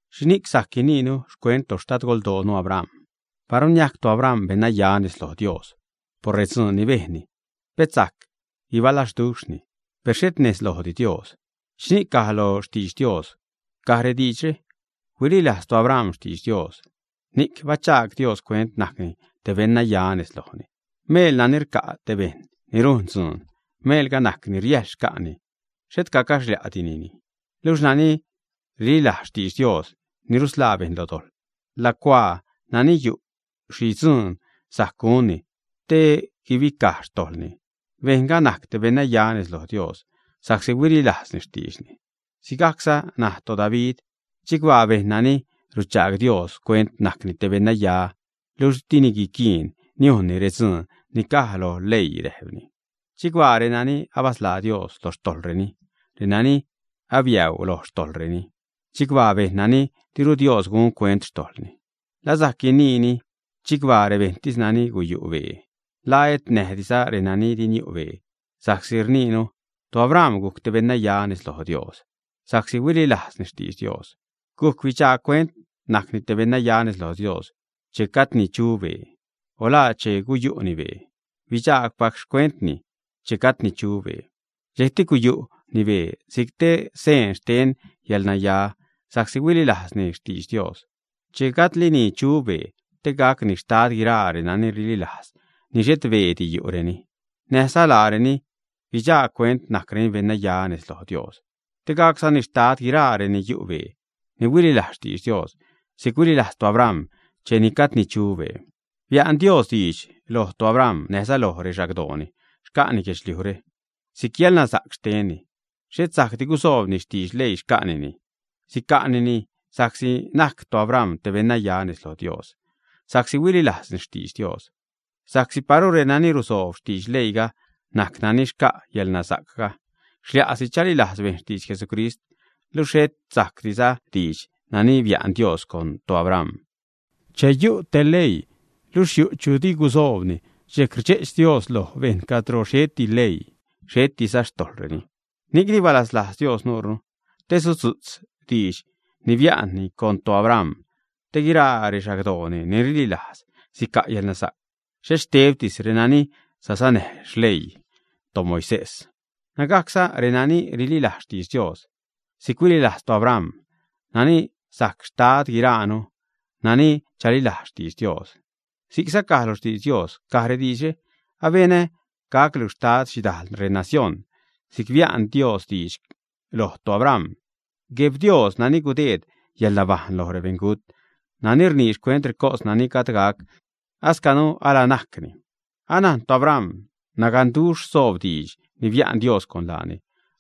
¿Xhini'c sajc guiniinu xcuent toxtadgoldoonu, Abram? Paru niajc toAbram beṉnaya nez loj Dios por redzuun ni bejnni, pet sajc guibalazduxhni, per xhet nez lojdi Dios. ¿Xhini'c caj lo xtidx Dios? Caj rediidxre: Huililajz toAbram xtidx Dios, ni'c bachaag Dios cuent najcni te beṉnaya nez lojni. Meel nani rca' te bejṉ ni rujn te dzuun, meelga najc ni riäjl xca'ni, xhet rcaxlia'dinini. Luxh nani rililajztis xtidx Dios ni rusḻaa bejṉ lo dojḻ, lacuaa naani yu' xhi dzuun sajc gunni te guibicaj xtojḻni, bejṉga najc te beṉnaya nez loj Dios, sa'csi huililajzni xtiidxni. Sigajcza naj toDavid, chicbaa bejṉ nani ruchaag Dios cuent najcni te beṉnaya luxh di niquiin niujnni redzuun ni caj lo leii. Räjpni: Chicbaa renani abasḻaa Dios lo xtojḻreni, renani abiäuu loj xtojḻreni. Chicbaa bejṉ nani diru Dios gun cuent xtojḻni. ¿La sajc guiniini chicbaa rebejṉtis nani guyu' bee, ä? ¿La et näjdiza renani di niu' bee, ä? Sa'csi rniinu: “ToAbram gujc te beṉnaya nez loj Dios sa'csi huililajzni xtidx Dios.” Guc bidxaag cuent najcni te beṉnaya nez loj Dios ¿che gajdni chu bee, ä? O ¿Laa che guyu'ni bee? Bidxaagpac xcuentni che gajdni chu bee. Dxejcti guyu'ni bee si'c te seen xten yäḻnaya sa'csi huililajzni xtidx Dios che gajdlini chu bee te gacni xtad guiraa renani rililajz laḻ ni xhet beedi yu'reni, te näjza laareni guidxaag cuent najcreni beṉnaya nez loj Dios, te gaczani xtad guiraa renani yu' bee ni huililajzza xtidx Dios si'c huililajz toAbram cheni gajdni chu bee. Bia'n Dios diidx loj toAbram näjza loj rexagdooni, xca'ni guedxliujre si'c yäḻnasa'c xtenni. Xhet sa'csi gusoobni xtidx leii xca'nini, sica'nini sa'csi najc toAbram te beṉnaya nez loj Dios sa'csi huililajzni xtidx Dios. Sa'csi paru renani rusoob xtidx leiiga najc nani xca' yäḻnasa'cga, xlia'si chalilajz bejṉ xtidx Jesucrist, luxh xhetza sajcdi diidx nani bia'n Dios loj toAbram. Che yu' te leii, luxh yu' chu di gusoobni, dxejc rdxe'ch Dios loj bejṉ. Cadro xheti leii, xhetiza xtojḻreni. Ni'cni balaslajz Dios nuunu, te sudzu'tz diidx ni bia'nni loj toAbram, te guiraa rexagdooni ni rililajz sica' yälnasa'c, xhet xtebtis renani sasanäj xleii toMoisés, nägajcza renani rililajz xtidx Dios si'c huililajz toAbram, nani najc xtad guiraanu nani chalilajz xtidx Dios. Si'cza caj lo xtidx Dios, caj rediidxre: “Abenä gaclu xtad xhidal renacióṉ.” Si'c bia'n Dios diidx loj toAbram, Gueb Dios nani gudeed yäḻnabajṉ loj rebeṉgut, nani rnii xcuent recos nani gajd gac ascanu ala najcni. Anajn toAbram naganduxh soob diidx ni bia'n Dios con laani,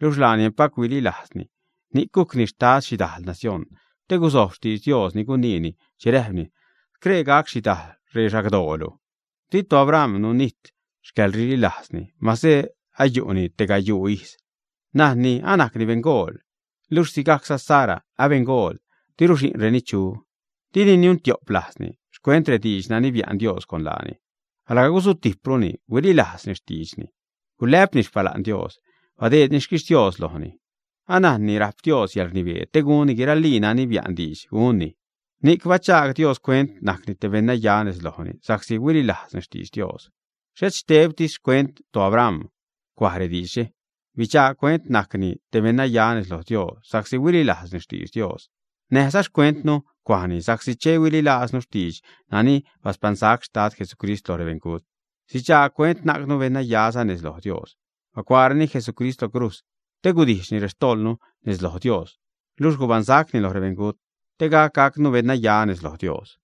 luxh laani empac huililajzni, ni'c gujcni xtad xhidajl nacióṉ, te gusojb xtidx Dios ni guniini che räjpni: “Scree gac xhidajl rexagdoolu.” Di toAbram nunijt xcäḻrililajzni, mase ayu'ni tegayuu ijz, najnni anajcni beṉgool, luxh sigajcza Sara abeṉgool diru xi'nreni chu. Dini niun-tio'p lajzni xcuent rediidx nani bia'n Dios con laani, alga gusutijpruni huililajzni xtiidxni, gulä'pni xpala'n Dios, badeedni xquixtios lojni. Anajnni rajp Dios yäḻrnibee te gunni guiralii nani bia'n diidx gunni. Ni'c bachaag Dios cuent najcni te beṉnaya nez lojni sa'csi huililajzni xtidx Dios. Xhet xtebtisdi xcuent toAbram cuaj rediidxre: “Bidxaag cuent najcni te beṉnaya nez loj Dios sa'csi huililajzni xtidx Dios”, näjza xcuentnu cuajni, sa'csi che chalilaaznu xtiidx nani baspaṉsac Xtad Jesucrist loj rebeṉgut, sidxaag cuent najcnu beṉnaya nez loj Dios. Bacuaareni Jesucrist lo crujz te gudijxni rextojḻnu nez loj Dios, luxh gubaṉsacni lo rebeṉgut, te gac gacnu beṉnaya nez loj Dios.